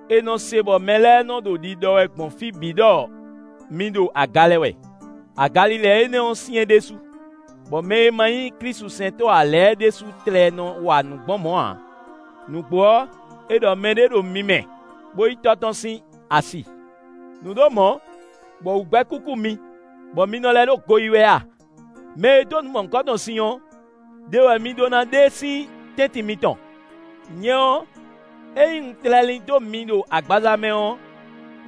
È nɔ se bɔ mɛ lɛ́ɛ nɔ ɖo ɖiɖɔ wɛ gbɔn fí bǐ ɖɔ mi ɖo aga lɛ wɛ; agalilɛ énɛ́ ɔ́ syɛ́n ɖésú, bɔ mɛ e ma nyí klísusɛntɔ́ ǎ lɛ́ɛ ɖésú tlɛ nɔ wa nǔ gbɔn mɔ̌ ǎ: nǔgbó ɔ́, è ɖɔ mɛɖé ɖo mi mɛ, bó yí tɔ́ tɔn sín asi. Nǔ ɖo mɔ̌, bɔ wú gbɛ́ kúkú mi, bɔ mi nɔ lɛ́ ɖo go yí wɛ a? Mɛ e dó nǔ mɔ̌hunkɔtɔn sin ɔ́, ɖe wɛ mi ɖó ná ɖe e sín tɛ́ntin mitɔn. Nyɛ ɔ́, ényí un tlɛ lín dó mi ɖo agbaza mɛ ɔ́,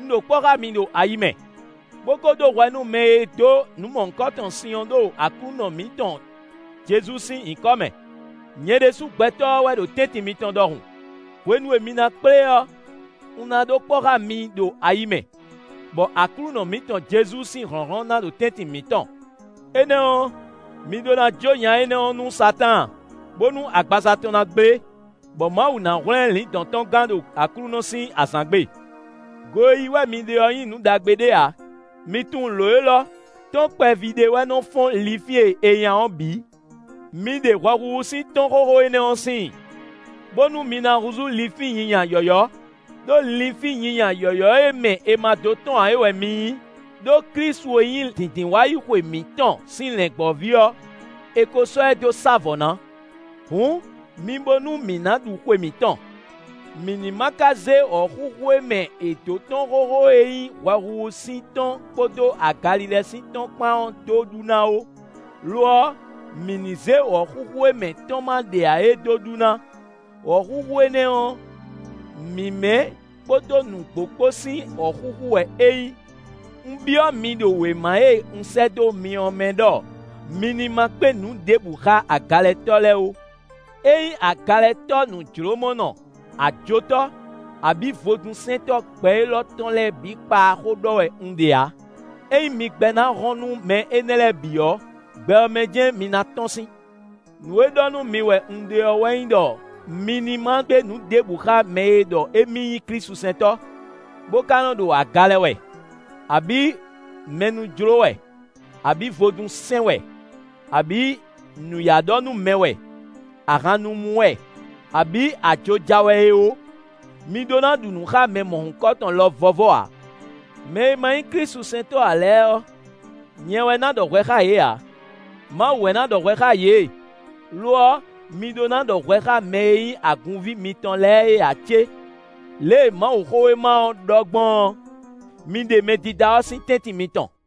un ɖo kpɔ́ xá mi ɖo ayi mɛ, bó ko ɖó hwɛ nú mɛ e dó nǔ mɔ̌hunkɔtɔn sin ɔ́ ɖo Aklúnɔ mǐtɔn Jezu sín nyǐkɔ mɛ, nyɛ ɖésú gbɛtɔ́ ɔ́ wɛ ɖo tɛ́ntin mitɔn ɖɔhun. Hwenu e mi ná kplé ɔ́, un ná ɖo kpɔ́ xá mi ɖo ayi mɛ, bɔ Aklúnɔ mǐtɔn Jezu sín hlɔ̌nhlɔ́n ná ɖo tɛ́ntin mǐtɔn. Énɛ́ ɔ́, mi ɖó ná jó nya énɛ́ ɔ́ nú Satáan, bónú agbaza tɔn ná gblé, bɔ Mawu ná hwlɛ́n lǐndɔ̌n tɔn gán ɖo Aklúnɔ sín azǎn gbe. Go e yí wɛ mi ɖe ɔ́ nyí nǔ ɖagbe ɖé ǎ. Mi tunwun lǒ élɔ́: “Tɔ́n kpɛví ɖé wɛ nɔ fɔ́n linfín e è nya ɔ́ bǐ.” Mi ɖe hwɛhuhu sín tɔ́n xóxó énɛ́ ɔ́ síin, bónú mi ná húzú linfín nyinya yɔ̌yɔ́; ɖó linfín nyinya yɔ̌yɔ́ e mɛ è ma dó tɔ́n ǎ é wɛ mi nyí; ɖó Klísu e nyí Dǐndínwáyixwe mǐtɔn sín lɛ̌ngbɔ́ví ɔ́, è ko sɔ́ ɛ dó sá vɔ̌ ná. Hǔn, mi bo nú mǐ ná ɖu xwe mǐtɔn; mǐ ní ma ka zé wɔ̌xúxú e mɛ è dǒ tɔ́n xóxó e nyí hwɛhuhu sín tɔ́n kpódó agalilɛ sín tɔ́n kpán ɔ́ dó ɖu ná ó; lo ɔ́, mǐ ní zé wɔ̌xúxú e mɛ tɔ́n má ɖe ǎ é dó ɖu ná; wɔ̌xúxú énɛ́ ɔ́, mǐmɛ́ kpódó nǔgbó kpó sín wɔ̌xúxú wɛ é nyí. Un byɔ́ mi ɖo wěma e un sɛ́ dó mi ɔ́ mɛ ɖɔ mi ní ma kpé nǔ ɖěbǔ xá agalɛtɔ́ lɛ́ɛ ó. Ényí agalɛtɔ́ nǔjlómɔnɔ, ajotɔ́ abǐ vodúnsɛntɔ́ gbɛ élɔ́ tɔn lɛ́ɛ bǐ kpaa xó ɖɔ wɛ un ɖe ǎ. Ényí mi gbɛ́ ná hɔn nú mɛ énɛ́ lɛ́ɛ bǐ ɔ́, gbɛ ɔ́ mɛ jɛ́n mi ná tɔ́n sín. Nǔ e ɖɔ nú mi wɛ un ɖe ɔ́ wɛ nyí ɖɔ mi ní ma kpé nǔ ɖěbǔ xá mɛ e ɖɔ émí nyí klísusɛntɔ́, bó ka nɔ ɖo aga lɛ wɛ, abǐ mɛ nú jló wɛ, abǐ vodún sɛn wɛ, abǐ nǔyá ɖɔ nú mɛ wɛ, ahan nu mú wɛ, abǐ ajo ja wɛ é ó. Mi ɖó ná ɖu nǔ xá mɛ mɔ̌hunkɔtɔn lɔ vɔ́vɔ́ ǎ. Mɛ e ma nyí klísusɛntɔ́ ǎ lɛ́ɛ ɔ́, nyɛ wɛ ná ɖɔ hwɛ xá yě ǎ; Mawu wɛ ná ɖɔ hwɛ xá yě. Lo ɔ́, mi ɖó ná ɖɔ hwɛ xá mɛ e nyí agunví mitɔn lɛ́ɛ é ǎ cé? Lě e Mawuxówéma ɔ́ ɖɔ gbɔn ɔ́: “Mi ɖe mɛdídá ɔ́ sín tɛ́ntin mitɔn.”